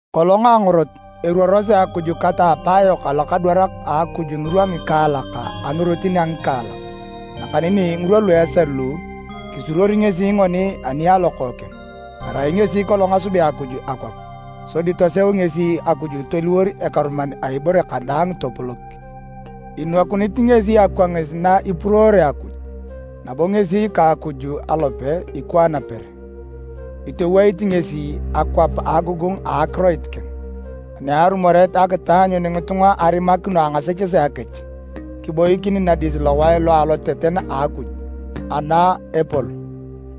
Kolong a angorot, eruorosi Akuj ka ta apaayok alokadwarak a Akuj ngirwa ngikaalak, a ngirotin a ngikaalak. Nakaneni ngirwa lu esal lu, kisuruor ngesi ngoni ani a Lokookeng. Erai ngesi kolong asubea Akuj akwap, sodi toseu ngesi Akuj toliwor ekeruman a ibore kadaang topolok. Inwakunit ngesi akwangis na ipuruore Akuj, nabo ngesi ka Akuj alope, ikwaan per. Itoweit ngesi akwap a agogongu a akiroit keng. Ani arumoret a akitaanyun ngitunga arimakino a ngasechesea kech, kiboikin nadis lowae lo a aloteten a Akuj, ana epol.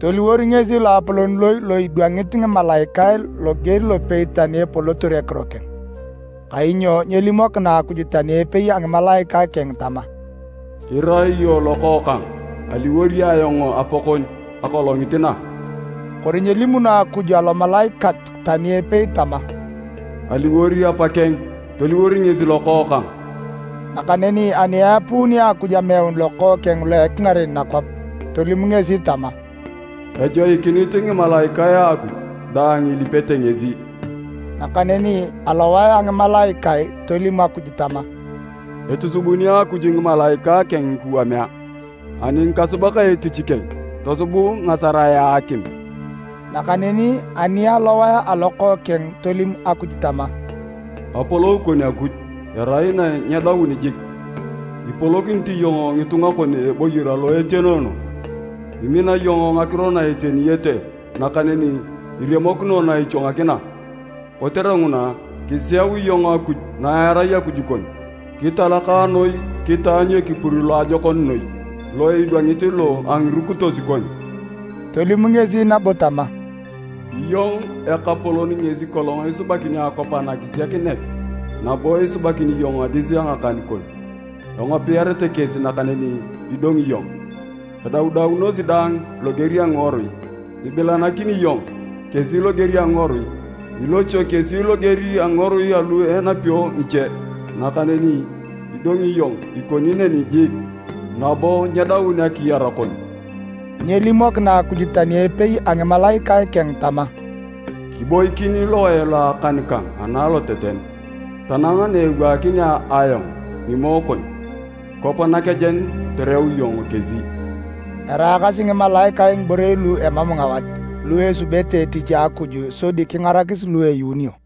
Toliwor ngesi loapolon noi lo idwangit ngimalaikae loger lopei tani epolotor ekiro keng. Kainyo nyelimokina Akuj tani epei a ngimalaikae keng tama, “Irai iyong Lokookang. Aliwor ayong Apakon akolongit na.” Kori nyelimuno Akuj alomalaikat tani epei tama, “Aliwor Apakeng, toliwor ngesi Lokookang.” Nakaneni ani eapuuni Akuj ameun Lokookeng lo ekingaren nakwap, tolim ngesi tama, “Ejoikinit ngimalaikae a Akuj daang ilipete ngesi.” Nakaneni alowae a ngimalaikae tolim Akuj tama, “Itusubuni Akuj ngimalaikae keng ngikuwamea, ani ngikasubak etich keng tosubut ngasarae a akim.” Nakaneni ani alowae a Lokookeng, tolim Akuj tama, “Apolou kon Akuj, erai na nyedaun jik! Ipolokinit iyong ngitunga kon a eboyor alo etenoono. Imina iyong ngakiro na eteniyete nakaneni iremokino na ichwangakina. Kotere nguna, kiseu iyong Akuj na erai Akuj kon kitalaka noi kitaanyu ekipur loajokon noi lo idwangit lo a ngirukitos kon.” Tolim ngesi nabo tama, “Iyong Ekapolon ngesi kolong isubakini akwap anakisiakinet nabo isubakini iyong adis a ngakan kon. Engopiarete kesi nakaneni idongi iyong. Edaudaunosi daang loger a ngiworui. Ibilanakini iyong kesi loger a eworu. Ilochio kesi loger a ngiworui alu enapio ngiche. Nakaneni idongi iyong ikoni neni jik, nabo nyedaun akiyar kon.” Nyelimokina Akuj tani epei a ngimalaikae keng tama, “Kiboikin lowae lo akan kang ana aloteten, tanang na ewaakinea ayong ngimoe kon kwap nakejen toreu iyong kesi.” Eraakasi ngimalaikae ngiborei lu emam ngawat lu esubete etich a Akuj sodi kingarakis lu eyuunio.